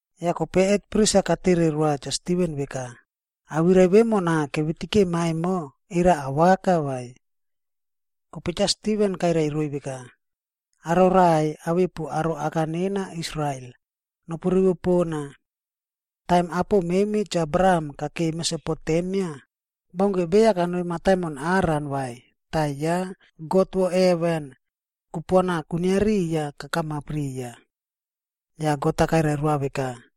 Yah kope hetpris-a katere roa Cha Stiven veka, “Awirai vemona kevitikema emo, era awaka vai?” Kope Cha Stiven kairai roiy veka, “Aro raꞌai awepu aro aka nena Israel, nopurivo pona! Taim apo memi Cha Abraham kakei Mesopotemia, baunke beya kanoi mataimon Haran vai tah ya God vo heven, kupuana kwinia riya kakamap riya. Yah God-a kairai roa veka,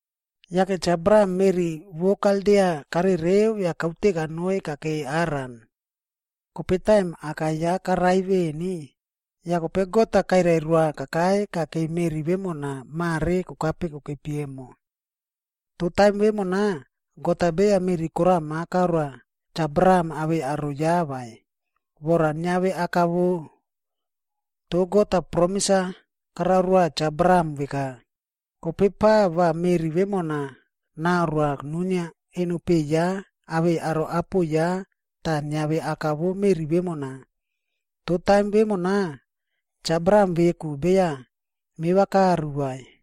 “Yake Cha Abraham meꞌri vo Kaldia karereu yah kaute kanoi kakei Haran. Kope taim aka ya karai veꞌeni, yah kope God-a kairai roa kakai kakei meꞌri vemona mare kokape kokepi emo. Toh taim vemona, God-a beya meꞌri korama karoa Cha Abraham awei aro ya vai, vora niave aka vo. Toh God-a promis-a karao roa Cha Abraham veka, kope pa va meꞌri vemona naroa nuinia enopeꞌe ya awei aro apo ya tah niave aka vo meꞌri vemona. Toh taim vemona, Cha Abraham veku beya meva karu vai.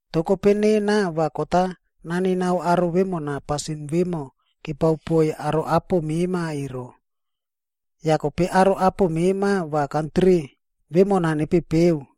Toh kope nena va kot-a nanenao aro vemona pasin vemo kepao poiy aro apo mema ero. Yah kope aro apo mema va kantri vemona nepepeu,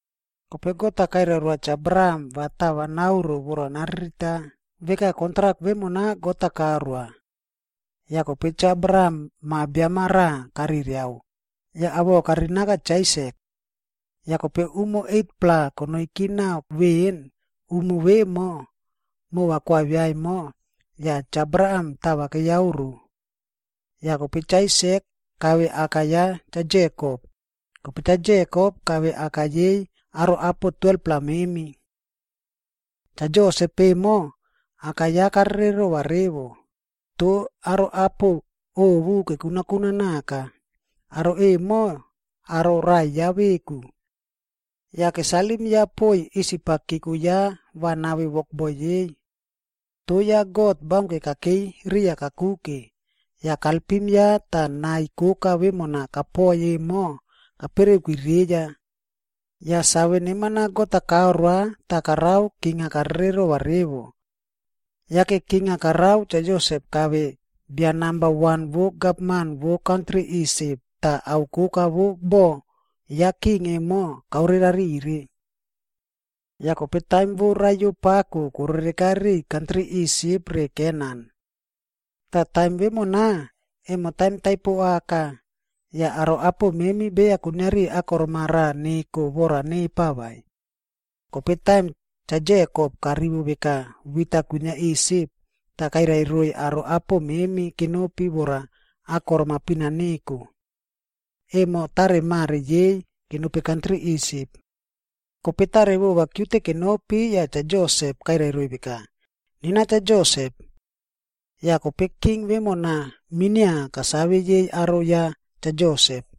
Kope God-a kairai roa Cha Abraham va tava naoro vora naririta veka kontrak vemona God-a karoa. Yah kope Cha Abraham ma biam-a raꞌa kareriao, yah awoꞌo karinaka Cha Aisak. Yah kope umo 8-pla konoiki nao veꞌen umo vemo mova koavia emo, yah Cha Abraham tava keyaoro. Yah kope Cha Aisak kave aka ya Cha Jekop, kope Cha Jekop kave aka yei aro apo 12-pla memi. “Cha Josep emo, aka ya karererova revo, toh aro apo ovu kekunakuna naka, aro emo aro raꞌai ya veku. Yah kesalim ya poiy Isip-a keko ya va nave wokboi yei. Toh ya God-a baunke kakei riya kakuke, yah kalpim ya tah nai koka vemona kapoi emo kapereuki reya. Yah save neman-a God-a karoa tah korao king-a karererova revo. Yake king-a karao Cha Josep kave bia namba wan vo gavman vo kantri Isip tah ao koka vo bo ya king emo, kaorerarire. “Yah kope taim vo raiyo pako korereka riꞌiy kantri Isip re Kenan. Tah taim vemona, emo taim taipo aka, yah aro apo memi beya kuiniari akorom-a raꞌa neko vora nepa vai. Kope taim Cha Jekop karivo veka wit-a kwinia Isip, tah kairai roiy aro apo memi kenopi vora akorom-a pina neko. Emo taremare yei kenopi kantri Isip. Kope tarevova kiute kenopi yah Cha Josep kairai roiy veka, ‘Nena Cha Josep.’ Yah kope king vemona minia kasave yei aro ya Cha Josep.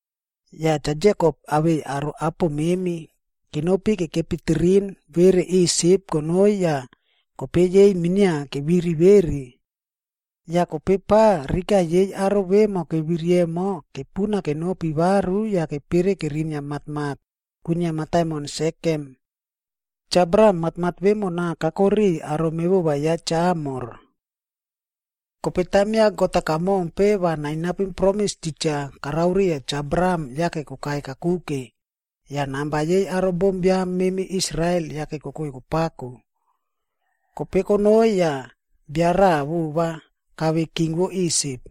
Yah Cha Jekop awei aro apo memi kenopi kekepi tirin vere Isip konoi yah kope yei minia keviri vere. Yah kope pa rika yei aro vemo keviri emo kepuna kenopi varu yah kepere kerinia matmat kwinia mataimon Sekem. Cha Abraham matmat vemona kako riꞌiy aro mevova ya Cha Hamor. “Kope taim ya God-a kamompe va nainapim promis titja karao riya Cha Abraham yake kokai kakuke, yah namba yei aro bombiam memi Israel yake kokoi kopako. Kope konoi yah bia raꞌa vova kave king vo Isip.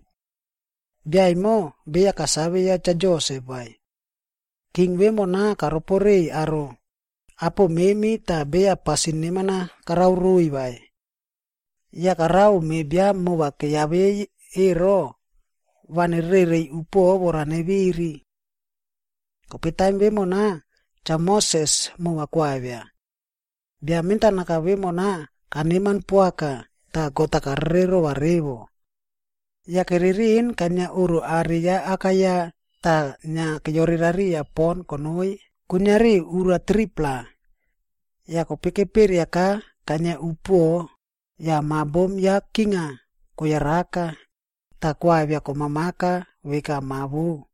Bia emo beya kasave ya Cha Josep vai. King vemona karoporeiy aro apo memi tah beya pasin neman-a karao roiy vai. Yah karao me biam mova keyavei ero, va nererereiy upuoꞌo vora neviri. “Kope taim vemona, Cha Moses mova koavia. Bia mentanaka vemona kaneman poaka tah God-a karererova revo.d Yah kereriꞌin kainia oꞌro are ya aka ya tah inia keyorerariya pon konoi kuiniari ura 3-pla. Yah kope keperiaka kainia upuoꞌo yah ma bom ya king-a koyaraka, tah koavia komamaka veka ma vou.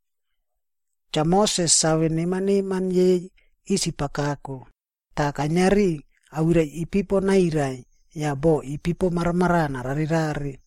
Cha Moses save neman neman yei Isip-a kako, tah kainiari awirai ipipo nairai yah boꞌo ipipo maramaraꞌa nararerare.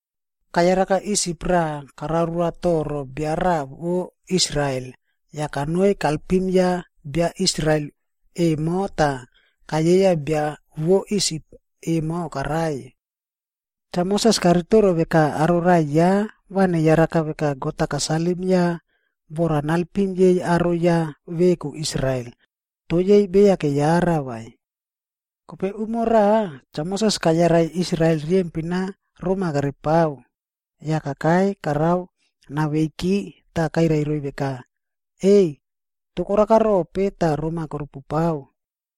Kayaraka Isip raꞌa karao roa toro bia raꞌa vo Israel, yah kanoi kalpim ya bia Israel emo tah kayeiya bia vo Isip emo karai. Cha Moses karitoro veka aro raꞌai ya va neyara veka God-a kasalim ya vora nalpim yei aro ya veku Israel, toh yei beya keyara vai. Kope umo raꞌa, Cha Moses kayarai Israel riyempin-a roma kerepao yah kakai karao naveiki tah kairai roiy veka, ‘Ei! Mopu raꞌai veku. Toh koraka rope, tah roma korupupao?’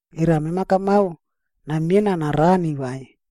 Era mema kamao namiena narani vai,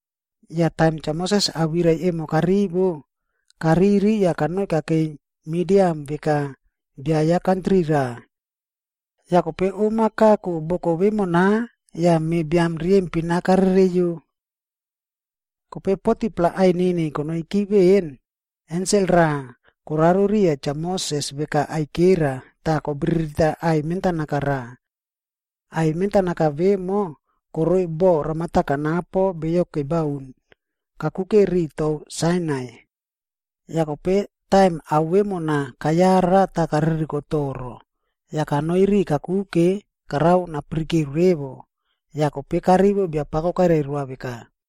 Yah taim Cha Moses awirai emo karivo, kariri yah kanoi kakei Midian veka bia ya kantri raꞌa. Yah kope om-a kako boko vemona yah me biam riyempin-a karereiyo. “Kope 40-pla ainini konoiki veꞌen, ensel raꞌa koraro riya Cha Moses veka aikera tah kobiririta aꞌai mentanaka raꞌa. Aꞌai mentanaka vemo koroi boꞌo ramata kanapo beyo kebaun kakuke riꞌi tou Sainai. Yah kope taim ao vemona kayara tah kaririko toro. Yah kanoi ri kakuke, karao napirike revo, yah kope karivo Biapako kairai roa veka,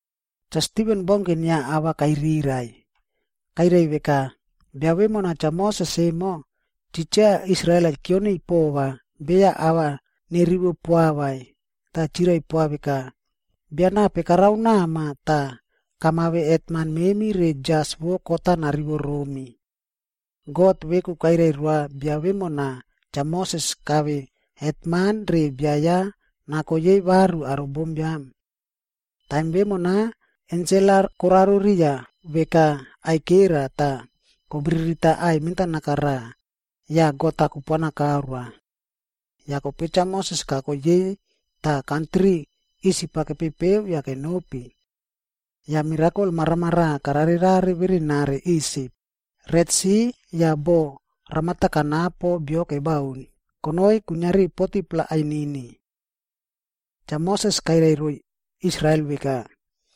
Cha Stiven baunke inia ava kairirai. Kairai veka, “Bia vemona Cha Moses emo, titja, Israel-a kioniy pova beya ava nerivo poa vai, tah chirai poa veka, ‘Bia nape karao nama tah kamave hetman memi re jas vo kot-a narivo romi?’ God veku kairai roa bia vemona Cha Moses kave hetman re bia ya nako yei varu aro bombiam. Taim vemona ensel-a koraro riya veka aikera tah kobiririta aꞌai mentanaka, yah God-a kupuana karoa. Yah kope Cha Moses kako yei tah kantri Isip-a kepepeu yah kenopi. Yah mirakol maramaraꞌa kararerare verenare Isip, Retsi yah boꞌo ramata kanapo bio kebaun, konoi kuiniari 40-pla ainini. “Cha Moses kairai roiy Israel veka,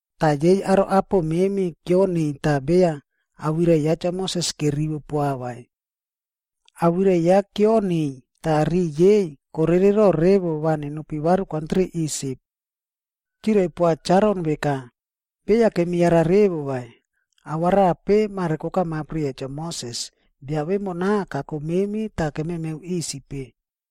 “Toh yei aro apo memi kioniy tah beya awirai ya Cha Moses kerivo poa vai. Awirai ya kioniy tah riꞌi yei korerero revo va nenopi varu kantri Isip. Chirai poa Cha Aron veka, ‘Beya kemiyara revo vai, ao arape mare kokamap riya Cha Moses, bia vemona kako memi tah kememeu Isip-e.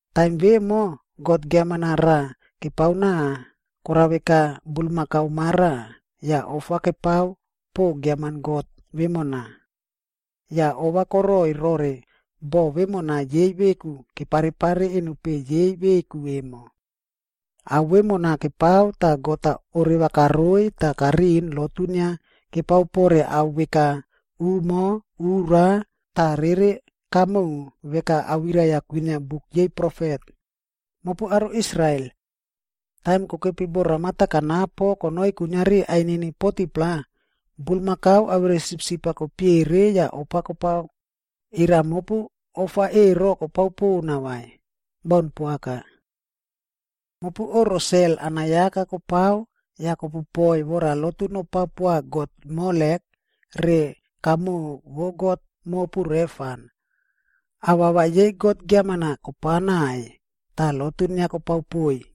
Taim vemo, god giaman-a raꞌa kepaonao koraveka bulmakau ma raꞌa, yah ofa kepao po giaman god vemona. Yah ova koroꞌoi rore boho vemona yei veku keparepare enopeꞌe yei veku emo. Ao vemona kepao tah God-a oreva karoiy tah kariꞌin lotu inia kepao pore ao veka umo, ura tah rere kamoꞌo, veka awirai-a kwinia buk yei profet, Mopu aro Israel! Taim kokepi boꞌo ramata kanapo konoi kuiniari ainini 40-pla, bulmakau awere sipsip-a kopiere yah ofa kopao, era mopu ofa ero kopao pona vai? Baun poaka. Mopu oꞌro sel anayaka kopao yah kopupoi vora lotu nopao poa god Molek re kamoꞌo vo god mopu Refan. Awawa yei god giaman-a kopaonai tah lotu inia kopao poiy.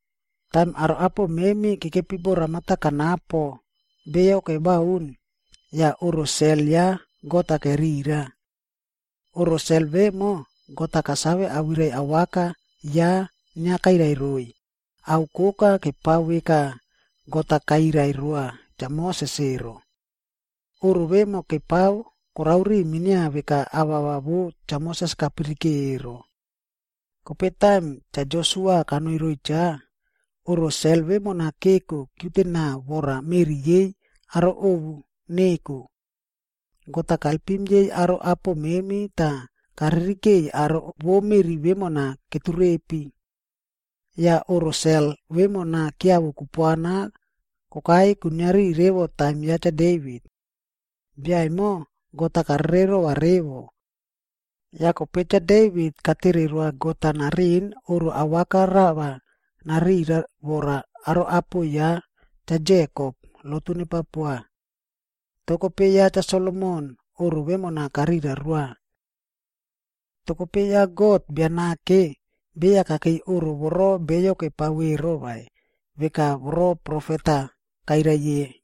“Taim aro apo memi kekepi boꞌo ramata kanapo beyo kebaun, yah oꞌro sel ya God-a kerira. Oꞌro sel vemo, God-a kasave awirai awaka ya inia kairai roiy, ao koka kepao veka God-a kairai roa Cha Moses ero. Oꞌro vemo kepao korao ri minia veka awawa vo Cha Moses kapirike ero. Kope taim Cha Josua kanoi roiy cha, oꞌro sel vemona keko kiutenao vora meꞌri yei aro ovu neko. God-a kalpim yei aro apo memi tah karirikeiy aro vo meꞌri vemona keturepi. Yah oꞌro sel vemona kiavo kupuana kokai kuiniari revo taim ya Cha Devit. Bia emo, God-a karererova revo. Yah kope Cha Devit katere roa God-a nariꞌin oꞌro awaka rava narira vora aro apo ya Cha Jekob lotu nepao poa. Toh kope ya Cha Solomon oꞌro vemona karira roa. “Toh kope ya God Bia Nake, beya kakei oꞌro voro beyo kepao ero vai, veka voro profet-a kairai ye.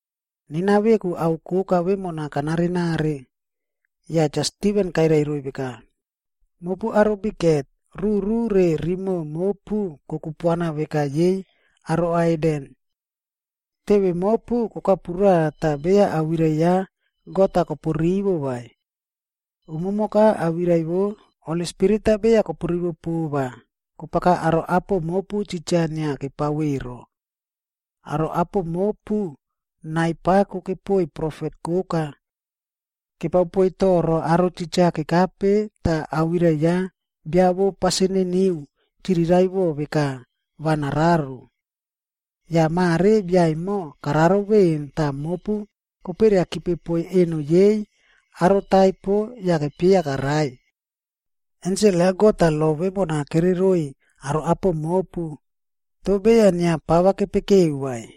Nena veku ao koka vemona kanarenare.” ’”k Yah Cha Stiven kairai roiy veka, “Mopu aro bikhet, ruru re rimoꞌo mopu kokupuana veka yei aro haiden. Teve mopu kokapura tah beya awirai ya God-a kopurivo vai. Umumoka awirai vo Holi Spirit-a beya kopurivo po vai, kopaka aro apo mopu titja inia kepao ero. Aro apo mopu nai pako kepoiy profet koka. Kepao poiy toro aro titja kekape tah awirai ya Bia vo Pasin Niniu chiriraiꞌvo veka va nararo. Yah mare bia emo kararo veꞌen tah mopu koperiakipe poiy eno yei aro taipo yah kopieya karai. Ensel ya God-a lo vemona kereroiy aro apo mopu, toh beya inia pava kopekeu vai.”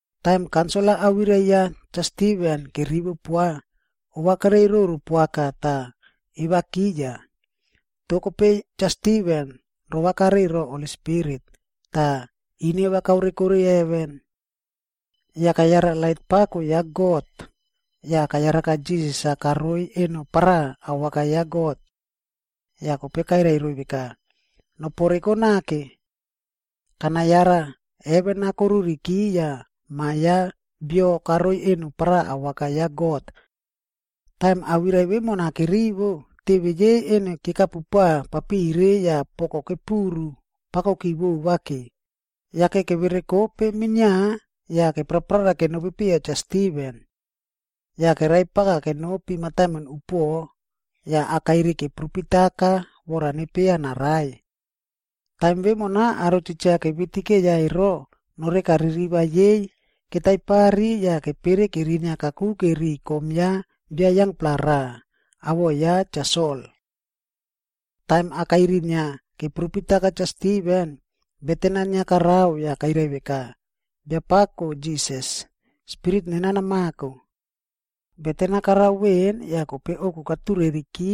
Taim kaunsil-a awirai ya Cha Stiven kerivo poa, ova kereiroro poaka tah evakiya. Toh kope Cha Stiven rovakare ro Holi Spirit, tah ineva kaoreko heven. Yah kayara lait pako ya God, yah kayaraka Jisas-a karoi eno paraꞌa awaka ya God. Yah kope kairai roiy veka, “Noporeko nake. Kanayara heven-a koruriki yah Ma Biam ya Bio karoi eno paraꞌa awaka ya God.” Taim awirai vemona kerivo, teve yei eno kekapupa papire yah poko kepuru pakoki vovake, yake keverekope minia yah keprara kenopi piya Cha Stiven. Yah keraipaka kenopi mataimon upuoꞌo, yah akairi keprupitaka vora nepieya narai. Taim vemona aro titja kevitikeiya ero, noreka ririva yei ketaipari yah kepere kerinia kakuke ri kom ya bia yangpla raꞌa, awoꞌo ya Cha Sol. Taim akairi inia keprupitaka Cha Stiven, beten-a inia karao yah kairai veka, “Biapako Jisas, spirit nena namako.” Beten-a karao veꞌen yah kope ouku katureki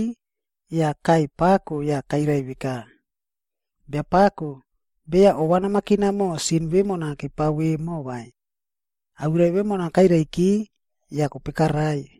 yah kaꞌai pako yah kairai veka, “Biapako, beya ova namakina mo sin vemona kepao vemo vai.” Awirai vemona kairaiki yah kope karai.